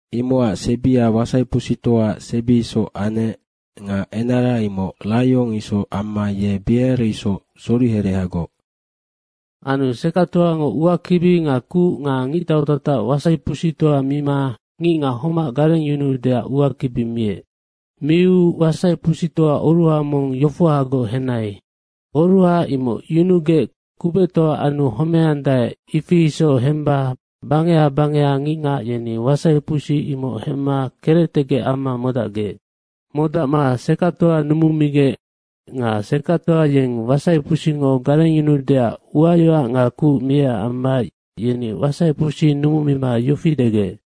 Imocac sebia wasaipusitoaac sebi isoc anec nga enara imoc raiong isoc amma ye bea isoc soriherehagoc. Anu sekactoango uakibi nga kuc nga ngictau tatac wasaipusitoa mima ngicngac homac garengyunuudeac uakibi miec. Miu wasaipusitoa oruha mong yofohagoc henai. Oruha imoc yunugec kubectoa anu homeandae, ifia isoc hemba bangeha bangeha ngicngac yeni wasaipusi imoc hemma kerectegec amma modacgec. Modacma sekactoa numumigec nga sekactoa yeng wasaipusingo garengyunuudeac uayoac nga kuc miecac amma yeni wasaipusi numumima yofi degec,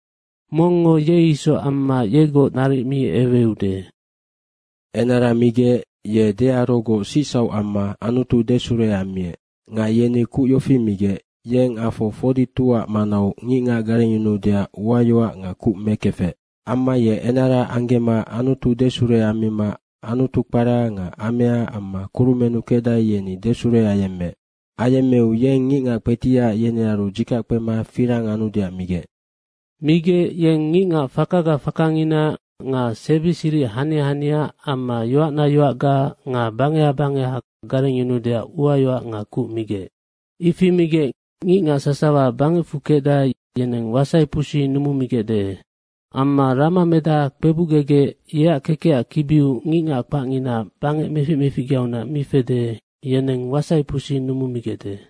“Mongngo ye isoc amma yegoc naric mi eweude.” Enara migec ye dearogoc sicsauc amma Anutu desure ammiec. Nga yeni kuc yofi migec, yeng afo 42ac manau ngicngac garengyunuudeac uayoac nga kuc mekefec. Amma ye enara anggema Anutu desure ammima Anutu kpara nga amea amma kurumennu kecdae, yeni desure ayemmeec. Ayemmeu yeng ngicngac kpetiac yenearu dzikac kpema firang anudeac migec. Migec yeng ngicngac fakaga fakangina nga sebi siric hania hania amma yoacna yoacga nga bangeha bangeha garengyunuudeac uayoac nga kuc migec. Ifi migec ngicngac sasawa bangecfu kecdae, yeneng wasaipusi numumigecde amma ramamedaha kpebucgegec, yeac kekecac kibiu ngicngac kpacngina bangec meficmeficgeaunac mi fede, yeneng wasaipusi numumigecde.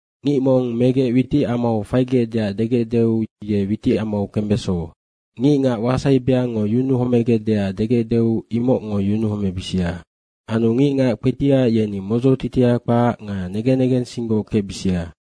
Ngic mong megec witicamau faigecdeac degecdeu ye witicamau kembeso. Ngicngac wasai beangngo yunuhomegecdeac degecdeu imocngo yunuhomebisia. Anu ngicngac kpetiac yeni modzotitia kpac nga negen negensinggoc kecbisia.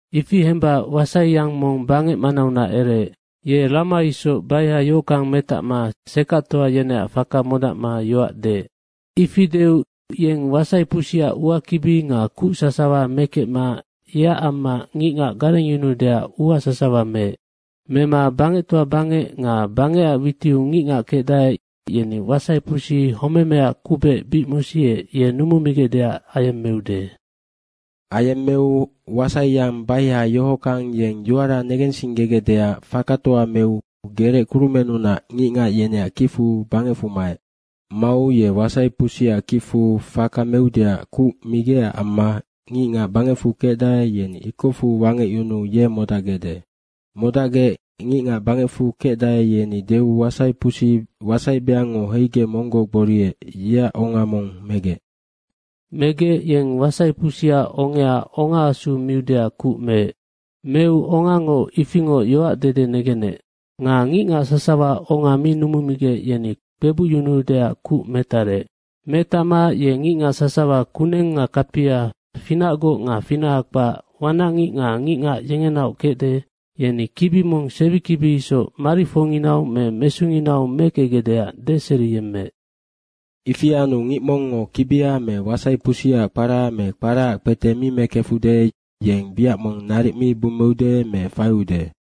Ifi hemba wasaiyang mong bangec manaunac ereec. Ye rama isoc baiha yohockang metacma sekactoa yeneac faka modacma yoac deec. Ifi deu yeng wasaipusiac uakibi nga kuc sasawa mekecma yeac amma ngicngac garengyunuudeac ua sasawa meec. Mema bangectoa bangec nga bangecac witiu ngicngac kecdae, yeni wasaipusi homemeaac kubec bic mosiec, ye numumigecdeac ayemmeude. Ayemmeu wasaiyang baiha yohockang, yeng yoara negensinggegecdeac fakatoa meu gerec kurumennunac ngicngac yeneac kicfu bangecfu maec. Mau ye wasaipusiac kicfu faka meudeac kuc migecac amma ngicngac bangecfu kecdae, yeni ikocfu wangecyunuu ye modacgecde. Modacgec ngicngac bangecfu kecdae, yeni deu wasaipusi wasai beangngo heigec monggoc gboriec, yeac onga mong megec. Megec yeng wasaipusiac ongea ongaasu miudeac kuc meec. Meu ongango ifingoc yoac dede negenec. Nga ngicngac sasawa onga mi numumigec, yeni kpebucyunuudeac kuc metarec. Metacma ye ngicngac sasawa kuneng nga kapia, finacgoc nga finaha kpac, wanacngic nga ngicngac yengenaoc kecde, yeni kibi mong sebikibi isoc marifoinginau me mesunginau mekecgecdeac deseriyemmeec. Ifi anu ngic mongngo kibia me wasaipusiac kpara me kparaac kpete mi mekefude, yeng wiac mong naric mi bummeude me faiude.